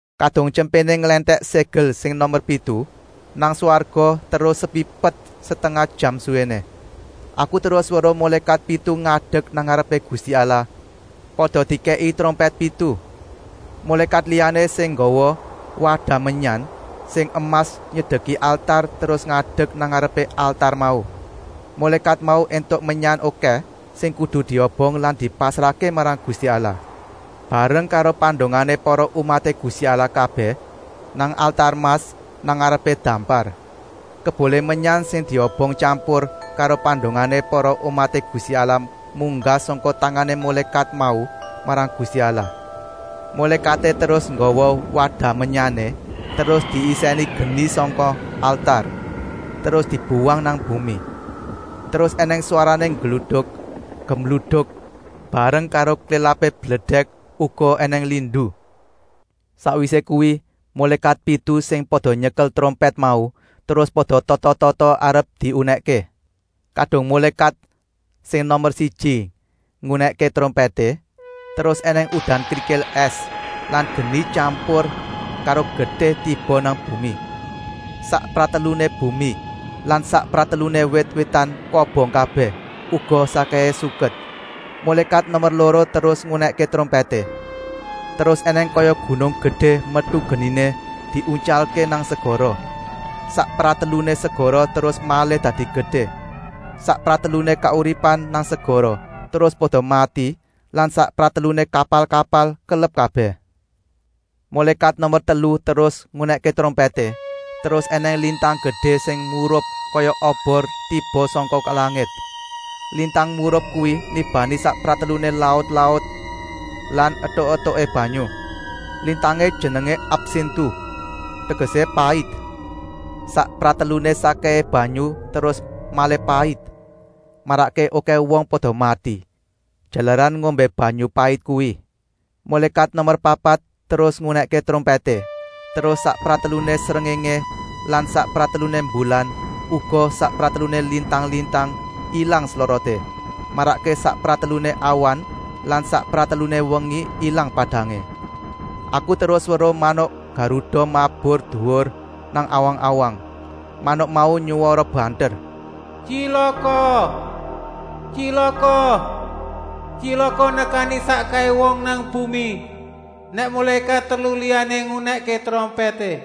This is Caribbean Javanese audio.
Kadung Tyempéné nglèntèk ségel sing nomer pitu, nang swarga terus sepi pet setengah jam suwéné. Aku terus weruh mulékat pitu ngadek nang ngarepé Gusti Allah pada dikèki trompèt pitu. Mulékat liyané sing nggawa wadah menyan sing emas nyedeki altar terus ngadek nang ngarepé altar mau. Mulékat mau éntuk menyan okèh sing kudu diobong lan dipasrahké marang Gusti Allah, bareng karo pandongané para umaté Gusti Allah kabèh, nang altar emas nang ngarepé dampar. Kebulé menyan sing diobong tyampur karo pandongané para umaté Gusti Allah munggah sangka tangané mulékat mau marang Gusti Allah. Mulékaté terus nggawa wadah menyané, terus diisèni geni sangka altar, terus dibuwang nang bumi. Terus ènèng swarané gluduk gemluduk bareng karo klélapé bledèk, uga ènèng lindu. Sakwisé kuwi mulékat pitu sing pada nyekel trompèt mau terus pada tata-tata arep diunèkké. Kadung mulékat sing nomer siji ngunèkké trompèté, terus ènèng udan krikil ès lan geni tyampur karo getih tiba nang bumi. Sak prateluné bumi lan sak prateluné wit-witan kobong kabèh, uga sakkèhé suket. Mulékat nomer loro terus ngunèkké trompèté. Terus ènèng kaya gunung gedé metu geniné diuntyalké nang segara. Sak prateluné segara terus malih dadi getih. Sak prateluné kauripan nang segara terus pada mati lan sak prateluné kapal-kapal kelep kabèh. Mulékat nomer telu terus ngunèkké trompèté, terus ènèng lintang gedé sing murup kaya obor, tiba sangka langit. Lintang murup kuwi nibani sak prateluné laut-laut lan etuk-etuké banyu. Lintangé jenengé Absintu, tegesé pait. Sak prateluné sakkèhé banyu terus malih pait, marakké okèh wong pada mati, jalaran ngombé banyu pait kuwi. Mulékat nomer papat terus ngunèkké trompèté, terus sak prateluné srengéngé lan sak prateluné mbulan, uga sak prateluné lintang-lintang ilang sloroté, marakké sak prateluné awan lan sak prateluné wengi ilang padangé. Aku terus weruh manuk garuda mabur duwur nang awang-awang. Manuk mau nyuwara banter. “Tyilaka, tyilaka! Tyilaka nekani sakkèhé wong nang bumi, nèk mulékat telu liyané ngunèkké trompèté.”